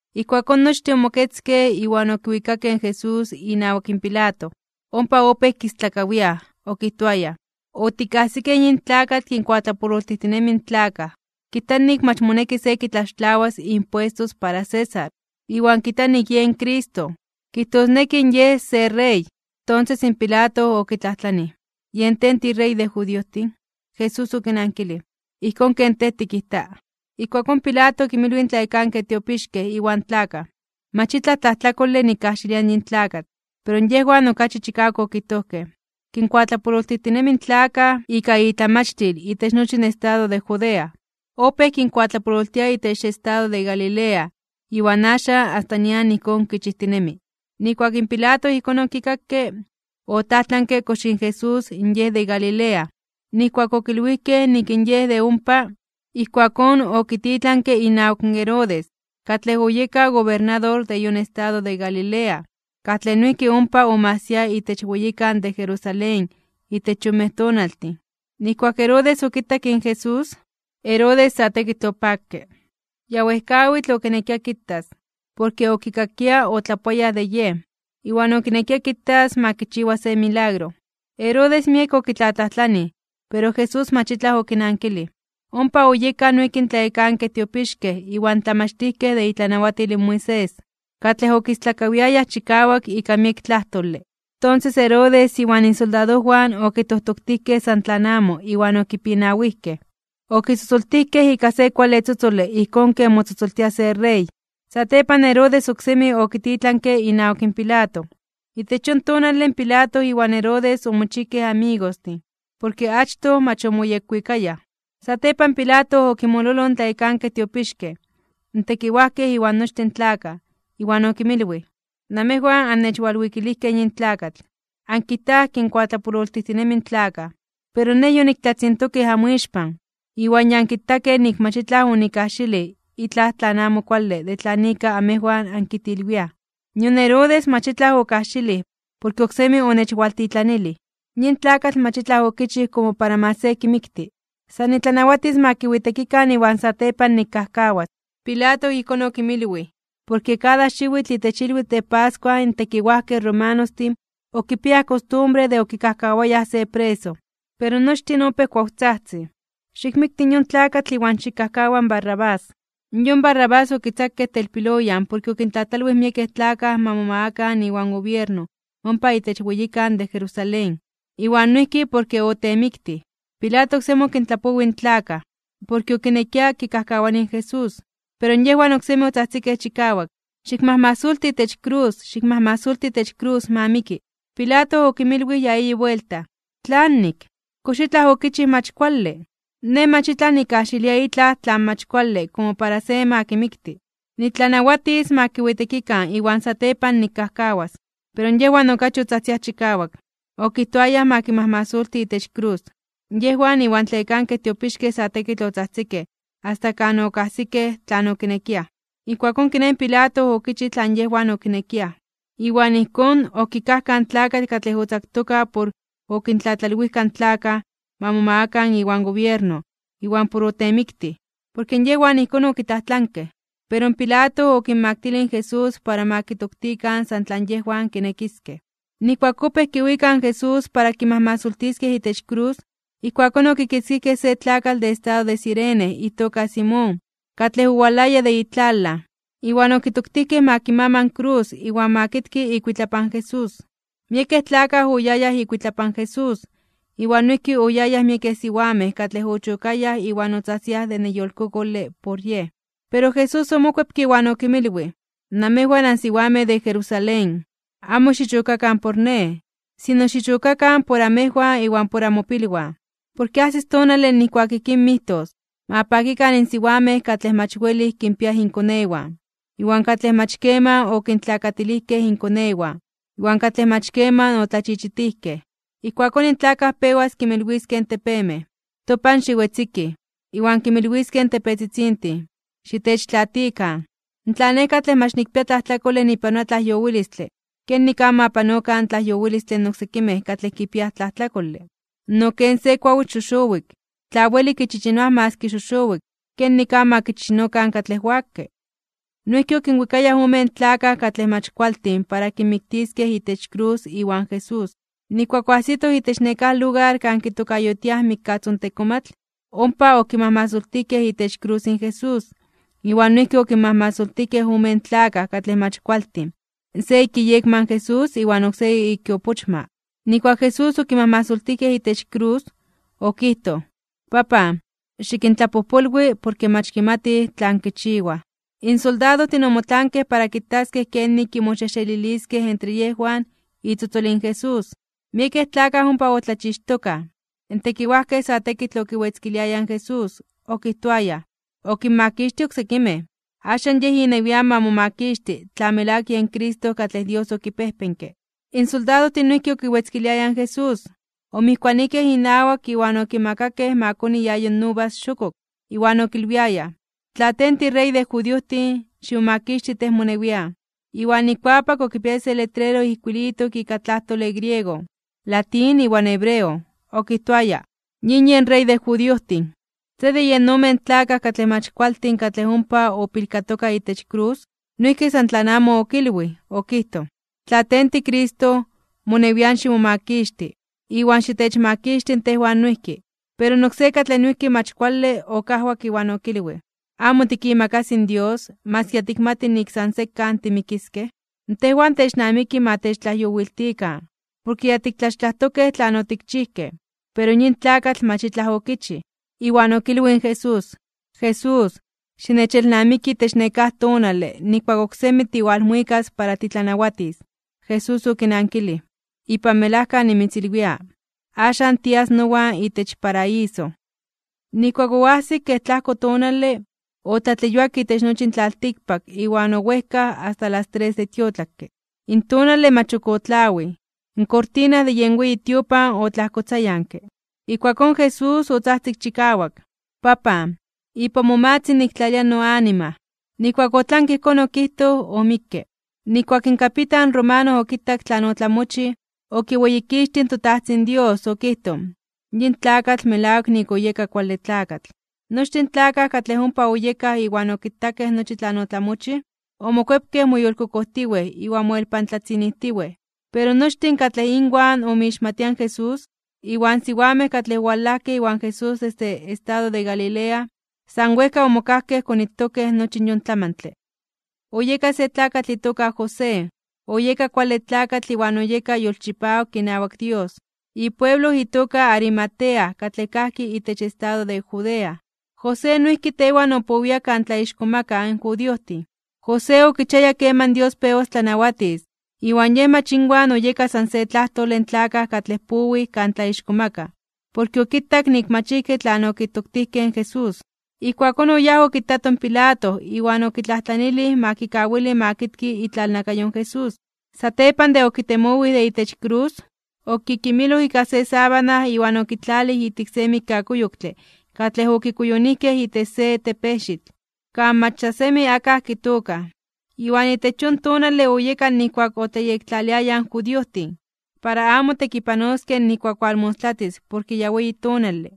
Ijkuakón nochtin omoketzkej, iwan okiwikakej in Jesús inawak Pilato. Ompa opéj kistlakawiaj, okijtoayaj: ―Otikajsikej yin tlakatl kinkuatlapololtijtinemi in tlakaj. Kijta nik mach moneki se kitlaxtlawas impuestos para César, iwan kijta nik yen Cristo, kijtosneki Yej se Rey. Tonses in Pilato okitlajtlanij: ―¿Yen tej tiRey de judiojtin? Jesús okinankilij: ―Ijkón ken tej tikijta. Ijkuakón Pilato okinmilwij in tlayekankej tiopixkej iwan tlakaj: ―Mach itlaj tlajtlakole nikkajxilia yin tlakatl. Pero yejwan okachi chikawak okijtojkej: ―Kinkuatlapololtijtinemi in tlakaj ika itlamachtil itech nochi in estado de Judea. Opéj kinkuatlapololtia itech estado de Galilea, iwan axan asta nian ijkón kichijtinemi. Nijkuak in Pilato ijkón okikakke, otlajtlanke kox in Jesús Yej de Galilea. Nijkuak okilwijkej nik in Yej de ompa, ijkuakón okititlanke inawak Herodes, katlej oyeka gobernador de yon estado de Galilea, katlej noijki ompa omajsia itech weyikan de Jerusalén itech yonmej tonaltin. Nijkuak Herodes okitak in Jesús, Herodes sa tekitl opakke. Ya wejkawitl okinekia kitas, porke okikakia otlapoayaj de Yej, iwan okinekia kitas ma kichiwa se milagro. Herodes miek okitlatlajtlanij, pero Jesús mach itlaj okinankilij. Ompa oyekaj noijki in tlayekankej tiopixkej iwan tlamachtijkej de itlanawatil in Moisés, katlej okistlakawiayaj chikawak ika miek tlajtole. Tonses Herodes iwan isoldadojwan okitojtoktijkej san tlan amo iwan okipinawijkej, okitzotzoltijkej ika se kuale tzotzole ijkón ken motzotzoltia se rey. Satepan Herodes oksemi okititlanke inawak Pilato. Itech yon tonale Pilato iwan Herodes omochijkej amigostin. Porke achtoj mach omoyekwikayaj. Satepan Pilato okinmololoj in tlayekankej tiopixkej, in tekiwajkej iwan nochtin in tlakaj, iwan okinmilwij: ―Namejwan annechwalwikilijkej yin tlakatl, ankijtaj kinkuatlapololtijtinemi in tlakaj. Pero nej yoniktlatzintokij amoixpan, iwan ya ankitakej nik mach itlaj onikkajxilij itlaj tlan amo kuale de tlan ika amejwan ankitilwiaj. Nion Herodes mach itlaj okajxilij, porke oksemi onechwaltitlanilij. Yin tlakatl mach itlaj okichij komo para ma se kimikti. San nitlanawatis ma kiwitekikan iwan satepan nikkajkawas. Pilato ijkón okinmilwij, porke kada xiwitl itech ilwitl de pascua in tekiwajkej romanostin okipiayaj kostumbre de okikajkawayaj se preso. Pero nochtin opéj kuawtzajtzij: ―¡Xikmikti yon tlakatl iwan xikkajkawa in Barrabás! Yon Barrabás okitzakej telpiloyan porke okintlatlalwij miekej tlakaj ma momagakan iwan gobierno ompa itech weyikan de Jerusalén, iwan noijki porke otemiktij. Pilato oksemi okintlapowij in tlakaj, porke okinekia kikajkawani in Jesús. Pero yejwan oksemi otzajtzikej chikawak: ―¡Xikmajmasolti itech krus! ¡Xikmajmasolti itech krus! ¡Ma miki! Pilato okinmilwij ya eyi buelta: ―¿Tlanik? ¿Kox itlaj okichij mach kuale? Nej mach itlaj nikkajxilia itlaj tlan mach kuale komo para ma se kimikti. Nitlanawatis ma kiwitekikan iwan satepan nikkajkawas. Pero yejwan okachi otzajtziaj chikawak, okijtoayaj ma kimajmasoltikan itech krus. Yejwan iwan tlayekankej tiopixkej sa tekitl otzajtzikej, asta kan okajsikej tlan okinekiaj. Ijkuakón kiné in Pilato okichij tlan yejwan okinekiaj. Iwan ijkón, okikajkaj in tlakatl katlej otzaktoka por okintlatlalwijka in tlakaj ma momagakaj iwan gobierno iwan por otemiktij. Porke yejwan ijkón okitlajtlankej. Pero Pilato okinmaktilij in Jesús para ma kitoktikan san tlan yejwan kinekiskej. Nijkuak opéj kiwikaj in Jesús para kimajmasoltiskej itech krus, ijkuakón okikitzkijkej se tlakatl de estado de Cirene itoka Simón, katlej owalaya de itlalaj, iwan okitoktijkej ma kimama in krus iwan ma kitki ikuitlapan Jesús. Miekej tlakaj oyayaj ikuitlapan Jesús, iwan noijki oyayaj miekej siwamej katlej ochokayaj iwan otzajtziaj de neyolkokole por Yej. Pero Jesús omokuepke iwan okinmilwij: ―Namejwan ansiwamej de Jerusalén, amo xichokakan por Nej, sino xichokakan por amejwan iwan por amopilwan. Porke ajsis tonale nijkuak ijkín mijtos: “Ma pakikan in siwamej katlej mach welij kinpiaj inkonewan, iwan katlej mach keman okintlakatilijkej inkonewan, iwan katlej mach keman otlachichitijkej.” Ijkuakón in tlakaj pewas kinmilwiskej in tepemej: “Topan xiwetzikij”, iwan kinmilwiskej in tepetzitzintin: “Xitechtlaatikan.” Tla Nej katlej mach nikpia tlajtlakole nipanoa tlajyowilistle, ¿kenik amo ma panokan tlajyowilistle in oksekimej katlej kipiaj tlajtlakole? No ken se kuawitl xoxowik, tla welij kichichinoaj maski xoxowik, ¿kenik amo ma kichichinokan katlej wakke? Noijki okinwikayaj omen tlakaj katlej mach kualtin para kinmiktiskej itech krus iwan Jesús. Nijkuak oajsitoj itech nekáj lugar kan kitokayotiaj Mikkatzontekomatl, ompa okimajmasoltijkej itech krus in Jesús, iwan noijki okinmajmasoltijkej omen tlakaj katlej mach kualtin: se ik iyekma in Jesús iwan oksé ik iopochma. Nijkuak in Jesús okimajmasoltijkej itech krus, okijtoj: ―Papan, xikintlapojpolwi, porke mach kimatij tlan kichiwaj. In soldadojtin omotlankej para kitaskej kenik kimoxejxeliliskej entre yejwan itzotzol in Jesús. Miekej tlakaj ompa otlachixtokaj. In tekiwajkej sa tekitl okiwetzkiliayaj in Jesús, okijtoayaj: ―Okinmakixtij oksekimej. Axan Yej inewian ma momakixti, tla melawak yen Cristo katlej Dios okipejpenke. In soldadojtin noijki okiwetzkiliayaj in Jesús, omijkuanijkej inawak iwan okimakakej ma koni iayo uvas xokok, iwan okilwiayaj: ―Tla tej tiRey de judiojtin, ximomakixti tej monewian. Iwan ikuapak okipiaya se letrero ijkuilitok ika tlajtole griego, latín iwan hebreo, okijtoaya: “YIN YEN REY DE JUDIOJTIN.” Se de yen omen tlakaj katlej mach kualtin katlej ompa opilkatoka itech krus, noijki san tlan amo okilwij, okijtoj: ―Tla tej tiCristo, monewian ximomakixti, iwan xitechmakixti in tejwan noijki. Pero in oksé katlej noijki mach kuale, okajwak iwan okilwij: ―¿Amo tikimakasi in Dios, maski ya tikmati nik san sekan timikiskej? Tejwan technamiki ma techtlajyowiltikan, porke ya tiktlaxtlajtokej tlan otikchijkej, pero yin tlakatl mach itlaj okichij. Iwan okilwij in Jesús: ―Jesús, xinechelnamiki itech nekáj tonale nijkuak oksemi tiwalmuikas para titlanawatis. Jesús okinankilij: ―Ipan melajka nimitzilwia, axan tias nowan itech paraíso. Nijkuak oajsik kej tlajko tonale, otlatleyuak itech nochi in tlaltikpak iwan owejkaj asta las tres de tiotlakke. In tonale mach ok otlawij, iwan kortina de yen weyi tiopan otlajkotzayanke. Ijkuakón Jesús otzajtzik chikawak: ―Papan, ipan momatzin niktlalia noanima. Nijkuak otlanke ijkón okijtoj, omikke. Nijkuak in kapitan romano okitak tlan otlamochij, okiweyikixtij in toTajtzin Dios, okijtoj: ―Yin tlakatl melawak nik oyeka kuale tlakatl. Nochtin in tlakaj katlej ompa oyekaj iwan okitakej nochi tlan otlamochij, omokuepkej moyolkokojtiwej iwan moelpantlatzinijtiwej. Pero nochtin katlej inwan omixmatia in Jesús, iwan siwamej katlej owalajkej iwan Jesús desde estado de Galilea, san wejka omokajkej konitokej nochi yon tlamantle. Oyeka se tlakatl itoka José. Oyeka kuale tlakatl iwan oyeka yolchipawak inawak Dios, ipueblo itoka Arimatea katlej kajki itech estado de Judea. José noijki tewan opowia kan tlaixkomakaj (tlatzonmanaj) in judiojtin. José okichiaya keman Dios pewas tlanawatis, iwan yej mach inwan oyeka san se tlajtole in tlakaj katlej powij kan tlaixkomakaj, porke okitak nik mach ijki tlan okitoktijkej in Jesús. Ijkuakón oyáj okitato in Pilato iwan okitlajtlanilij ma kikawili ma kitki itlalnakayo in Jesús. Satepan de okitemowij de itech krus, okikimiloj ika se sábana iwan okitlalij ijtik se mikkakuyoktle katlej okikuyonijkej itech se tepejxitl, kan mach ya semi akaj kitookaj. Iwan itech yon tonale oyeka nijkuak otlayektlaliayaj in judiojtin, para amo tekipanoskej nijkuak walmostlatis porke ya weyi tonale,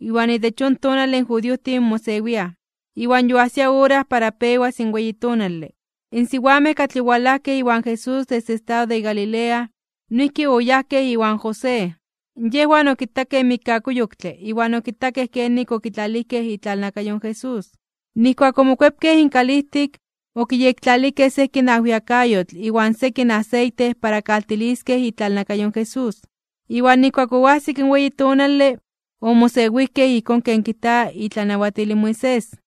iwan itech yon tonale in judiojtin mosewiaj. Iwan yoajsia ora para pewas in weyi tonale. In siwamej katlej owalajkej iwan Jesús desde estado de Galilea, noijki oyajkej iwan José. Yejwan okitakej in mikkakuyoktle, iwan okitakej kenik okitlalijkej itlalnakayo in Jesús. Nijkuak omokuepkej inkalijtik, okiyektlalijkej sekin ajwiakayotl iwan sekin aseite para kaltiliskej itlalnakayo in Jesús. Iwan nijkuak oajsik in weyi tonale, omosewijkej ijkón ken kijta itlanawatil Moisés.